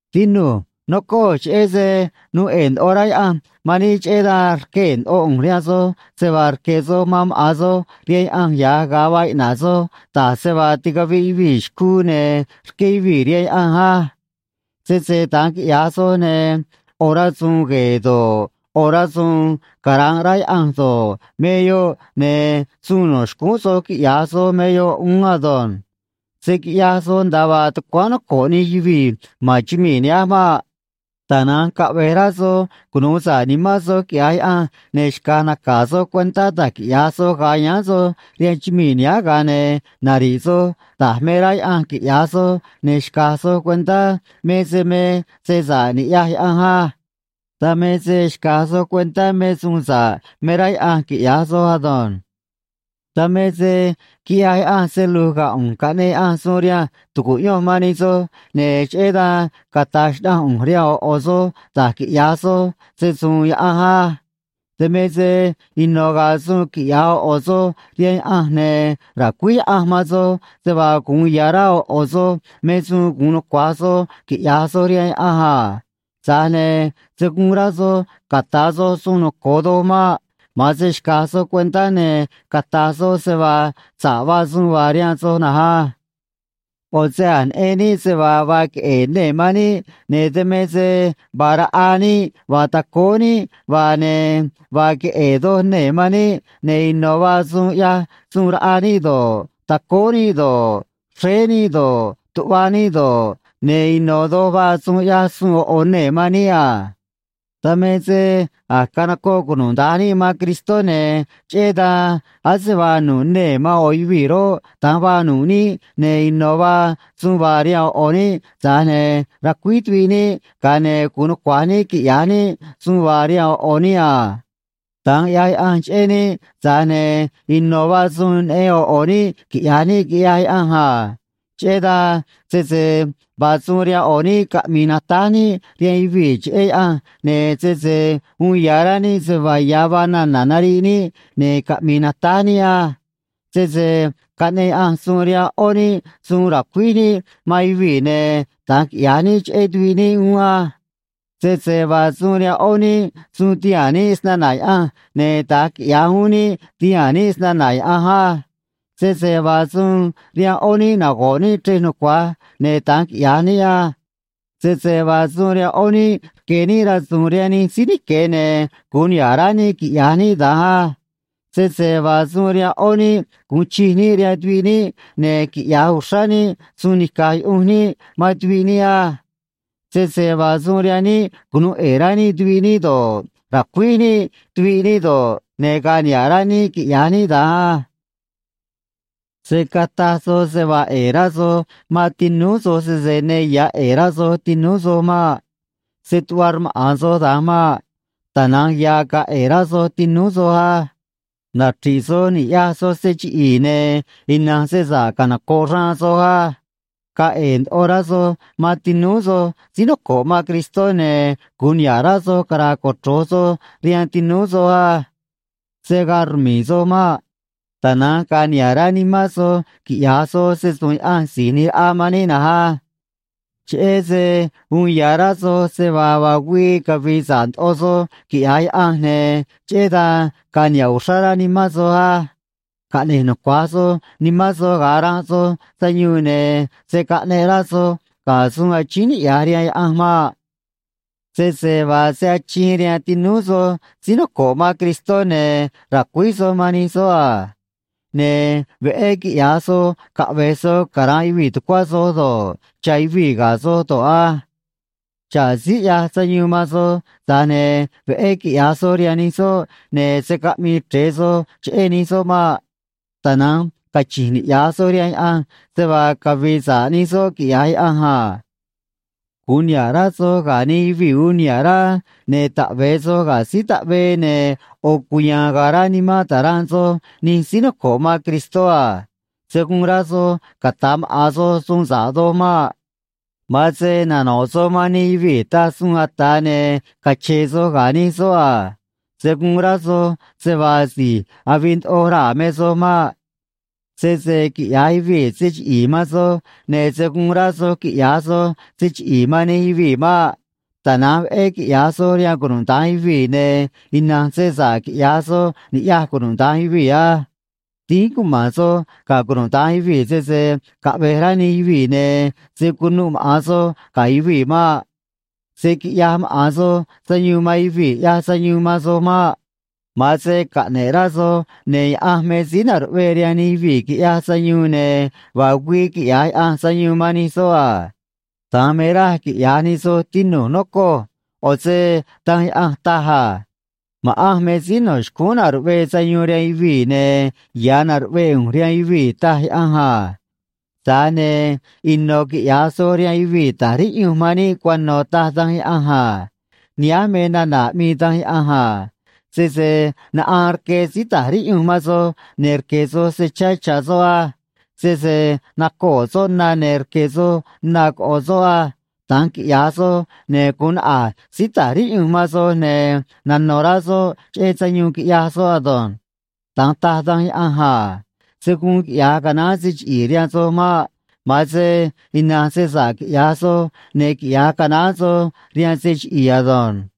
Tinu̱j, nocoj, cheꞌé se nuu ꞌe̱e̱ ndoꞌo rá Yaꞌanj man níꞌ, cheꞌé dan rquee̱ ndoꞌo ꞌu̱nj rihaan soj se vaa rque̱ soj man maꞌa̱n soj rihaan Yaꞌanj ya̱j ga̱a vaa iꞌna̱ꞌ soj, da̱j se vaa ticaviꞌ yuvii̱ xcuu ne̱ rqué yuvii̱ rihaan Yaꞌanj á. Sese da̱nj quiꞌya̱j soj, ne̱ ꞌo̱ rasu̱u̱n gue̱e̱ do̱ꞌ, ꞌo̱ rasu̱u̱n cara̱nꞌ rá Yaꞌanj do̱ꞌ, me yoꞌ, ne̱ suun no̱ xcúún soj quiꞌya̱j soj me yoꞌ uún ado̱nj. Se̱ quiꞌyaj soj nda̱a vaa tucuáán noco̱ꞌ nij yuvii̱ ma̱n chumii̱ nihánj maꞌ. Tana̱nj caꞌve̱j rá soj cunu̱u sa̱ꞌ nimán soj quiꞌya̱j Yaꞌanj, ne̱ xca̱j naca̱ soj cuentá da̱j quiꞌya̱j soj ga̱a yáán soj rihaan chumii̱ nihánj, ga̱a ne̱ nari̱ꞌ soj da̱j me rá Yaꞌanj quiꞌya̱j soj, ne̱ xca̱j soj cuentá me se me se sa̱ꞌ niꞌya̱j Yaꞌanj á. Dan me se xca̱j soj cuentá me suun sa̱ꞌ me rá Yaꞌanj quiꞌya̱j soj ado̱nj. Dan me se quiꞌyaj Yaꞌanj se lu̱j ga̱ ꞌu̱nj, caꞌneꞌ Yaꞌanj suun rihanj tu̱cuꞌyonj man nij soj, ne̱ cheꞌé dan cata̱j xnaꞌanj ꞌu̱nj rihaan ꞌo̱ ꞌo̱ soj da̱j quiꞌya̱j soj se‑su̱u̱n Yaꞌanj á. Dan me se ino̱ ga̱a̱ suun quiꞌya̱j ꞌo̱ ꞌo̱ soj rihaan Yaꞌanj, ne̱ ra̱cuíj Yaꞌanj man soj se vaa gu̱un ya̱ rá ꞌo̱ ꞌo̱ soj me suun gu̱un nucua̱j soj quiꞌya̱j soj rihaan Yaꞌanj a. Tza̱j ne̱ se̱ guun rá soj ca̱ta̱ soj suun noco̱o doj maꞌ. Ma̱an se xca̱j soj cuentá, ne̱ cata̱j soj se vaa sa̱ꞌ vaa suun vaa rihaan soj na̱nj á. ꞌO̱ se a̱j neꞌen níꞌ se vaa vaa queꞌe̱e̱ nee̱ man níꞌ, ne̱ dan me se vaa raꞌa níꞌ vaa tacóó níꞌ vaa, ne̱ vaa queꞌe̱e̱ doj nee̱ man níꞌ, ne̱ ino̱ vaa suun ꞌyaj suun raꞌa níꞌ do̱ꞌ, tacóó níꞌ do̱ꞌ, xréé níꞌ do̱ꞌ, tuꞌva níꞌ do̱ꞌ, ne̱ ino̱ doj vaa suun ꞌyaj suun ꞌo̱ ꞌo̱ nee̱ man níꞌ a. Dan me se a̱j canocoꞌ cunuda̱nj níꞌ man Cristó, ne̱ cheꞌé dan ase vaa nu̱ꞌ nee̱ man ꞌo̱ yuvii̱ roꞌ, da̱nj vaa nu̱ꞌ níꞌ, ne̱ ino̱ vaa suun vaa rihaan ꞌo̱ ꞌo̱ níꞌ, tza̱j ne̱ racuíj tuviꞌ níꞌ, ga̱a ne̱ gu̱un nucua̱j níꞌ quiꞌya̱j níꞌ suun vaa rihaan ꞌo̱ ꞌo̱ níꞌ a. Da̱nj ꞌyaj Yaꞌanj cheꞌé níꞌ, tza̱j ne̱ ino̱ vaa suun neꞌen ꞌo̱ ꞌo̱ níꞌ quiꞌya̱j níꞌ, quiꞌyaj Yaꞌanj a. Cheꞌé dan sese vaa suun rihaan ꞌo̱ níꞌ caꞌmi̱i̱ natáj níꞌ rihaan yuvii̱ cheꞌé Yaꞌanj, ne̱ sese uun ya̱ rá níꞌ se vaa ya̱ vaa nana̱ nariꞌ níꞌ, ne̱ caꞌmi̱i̱ natáj níꞌ á. Sese caꞌneꞌ Yaꞌanj suun rihaan ꞌó níꞌ suun racuíj níꞌ man yuvii̱, ne̱ da̱nj quiꞌya̱j níꞌ cheꞌé tuviꞌ níꞌ uún á. Sese vaa suun rihaan ꞌó níꞌ suun tihaa̱n níꞌ snana̱ Yaꞌanj, ne̱ da̱nj quiꞌya̱j uún níꞌ, ti̱haa̱n níꞌ snana̱ Yaꞌanj á. Sese vaa suun rihaan ꞌó níꞌ nago̱ꞌ níꞌ chrej nucua̱j, ne̱ da̱nj quiꞌya̱j níꞌ á. Sese vaa suun rihaan ꞌó níꞌ rque̱ níꞌ rasu̱u̱n rihaan nij síí nique̱, ne̱ gu̱un niha̱ꞌ rá níꞌ quiꞌya̱j níꞌ da̱nj á. Sese vaa suun rihaan ꞌó níꞌ gu̱un chij níꞌ rihaan tuviꞌ níꞌ, ne̱ quiꞌya̱j uxrá níꞌ suun ni̱caj yuꞌunj níꞌ man tuviꞌ níꞌ á. Sese vaa suun rihaan níꞌ cunu̱u ꞌe̱e̱ rá níꞌ tuviꞌ níꞌ do̱ꞌ, ra̱cuíj níꞌ tuviꞌ níꞌ do̱ꞌ, ne̱ ga̱a̱ niha̱ꞌ rá níꞌ quiꞌya̱j níꞌ da̱nj á. Se̱ cataj soj se vaa ꞌe̱e̱ rá soj man tinúú soj, sese ne ya̱ ꞌe̱e̱ rá soj tinúú soj maꞌ. Se̱ tuꞌva rmaꞌa̱n soj da̱nj maꞌ. Tana̱nj ya̱ ga̱a̱ ꞌe̱e̱ rá soj tinúú soj á. Nachri̱ꞌ soj ni̱ꞌyaj soj se chiꞌi̱i̱, ne̱ ina̱nj se sa̱ꞌ canoco̱ꞌ xraan soj á. Ga̱a̱ ꞌe̱e̱ ndoꞌo rá soj man tinúú soj síí noco̱ꞌ man Cristó, ne̱ gu̱un niha̱ꞌ rá soj cara̱a̱ cochro̱j soj rihaan tinúú soj á. Se̱ gaa rmi̱i̱ soj maꞌ. Tana̱nj ga̱a̱ niha̱ꞌ rá nimán soj quiꞌya̱j soj se‑su̱u̱n Yaꞌanj Si̱j ꞌNi̱j Raꞌa man níꞌ na̱nj á. Cheꞌé se uun ya̱ rá soj se vaa vaa güii cavi̱i̱ sa̱ꞌ ndoꞌo soj, quiꞌya̱j Yaꞌanj, ne̱ cheꞌé dan ga̱a̱ niha̱ꞌ uxrá rá nimán soj á. Caꞌne̱j nucuaj soj nimán soj ga̱a ranꞌ soj sayuun, ne̱ se̱ caꞌneꞌ rá soj ga̱ suun achíín niꞌya̱j rihaan Yaꞌanj maꞌ. Sese vaa se achiin rihaan tinúú soj síí noco̱ꞌ man Cristó, ne̱ ra̱cuíj soj man nij soꞌ a. Ne̱ veꞌé quiꞌya̱j soj caꞌve̱j soj cara̱nꞌ yuvii̱ tucuá soj do̱ꞌ, cha̱ yuvii̱ ga̱ soj do̱ꞌ á. Xa̱ꞌ síí ꞌyaj sayuun man soj, tza̱j ne̱ veꞌé quiꞌya̱j soj rihaan nij soꞌ, ne̱ se̱ caꞌmii chre̱e soj cheꞌé nij soꞌ maꞌ. Tana̱nj cachi̱nj niꞌya̱j soj rihaan Yaꞌanj se vaa cavi̱i̱ sa̱ꞌ nij soꞌ quiꞌya̱j Yaꞌanj a. Gu̱un niha̱ꞌ rá soj ga̱ nij yuvii̱ uun niha̱ꞌ rá, ne̱ taꞌve̱e soj ga̱ síí taꞌvee, ne̱ ꞌo̱ cuya̱a̱n ga̱a̱ rá nimán ta̱ranꞌ soj nij síí noco̱ꞌ man Cristó a. Se̱ guun rá soj ca̱ta̱ maꞌa̱n soj suun sa̱ꞌ doj maꞌ. Ma̱an se nano̱ꞌ soj man nij yuvii̱ taj suun ata̱, ne̱ cache̱e̱ soj ga̱ nij soꞌ a. Se̱ guun rá soj se vaa si̱j avii ndoꞌo raa̱ me soj maꞌ. Sese quiꞌya̱j yuvii̱ se chiꞌi̱i̱ man soj, ne̱ se̱ guun rá soj quiꞌya̱j soj se chiꞌi̱i̱ man nij yuvii̱ maꞌ. Tana̱nj veꞌé quiꞌya̱j soj rihaan cunuda̱nj yuvii̱, ne̱ ina̱nj se sa̱ꞌ quiꞌya̱j soj ni̱ꞌyaj cunuda̱nj yuvii̱ á. Dínj cuma̱n soj ga̱ cunuda̱nj yuvii̱, sese caꞌve̱j rá nij yuvii̱, ne̱ se̱ cunuꞌ maꞌa̱n soj ga̱ yuvii̱ maꞌ. Se̱ quiꞌyaj maꞌa̱n soj sayuun man yuvii̱ ꞌyaj sayuun man soj maꞌ. Ma̱an se caꞌne̱ꞌ rá soj, ne̱ Yaꞌanj me síí na̱ruꞌvee rihaan nij yuvii̱ quiꞌyaj sayuun, ne̱ vaa güii quiꞌya̱j Yaꞌanj sayuun man nij soꞌ a. Da̱nj me raj quiꞌya̱j nij soj, tinu̱j, nocoj. ꞌO̱ se Danj Yaꞌanj taj a: “Ma̱ꞌanj me síí no̱ xcúún na̱ruꞌvee sayuun rihaan yuvii̱, ne̱ ya̱ na̱ruꞌvee ꞌu̱nj rihaan yuvii̱”, taj Yaꞌanj a. Tza̱j ne̱ ino̱ quiꞌya̱j soj rihaan yuvii̱ ta̱j riꞌyunj man níꞌ cuano̱, taj Danj Yaꞌanj a. Nihánj me nana̱ aꞌmii Danj Yaꞌanj a: “Sese naꞌaan rque síí ta̱j riꞌyunj man soj, ne̱ rque̱ soj se chá cha̱ soꞌ á. Sese nacoo̱ soꞌ na, ne̱ rque̱ soj na coꞌo̱ soꞌ á. Da̱nj quiꞌya̱j soj, ne̱ gu̱un naꞌa̱j síí ta̱j riꞌyunj man soj, ne̱ nano̱ rá soꞌ cheꞌé sayuun quiꞌyaj soꞌ ado̱nj.” Da̱nj taj Danj Yaꞌanj a. Se̱ guun quiꞌya̱j canaán se chiꞌi̱i̱ rihaan soj maꞌ. Ma̱an se ina̱nj se sa̱ꞌ quiꞌya̱j soj, ne̱ quiꞌya̱j canaán soj rihaan se chiꞌi̱i̱ ado̱nj.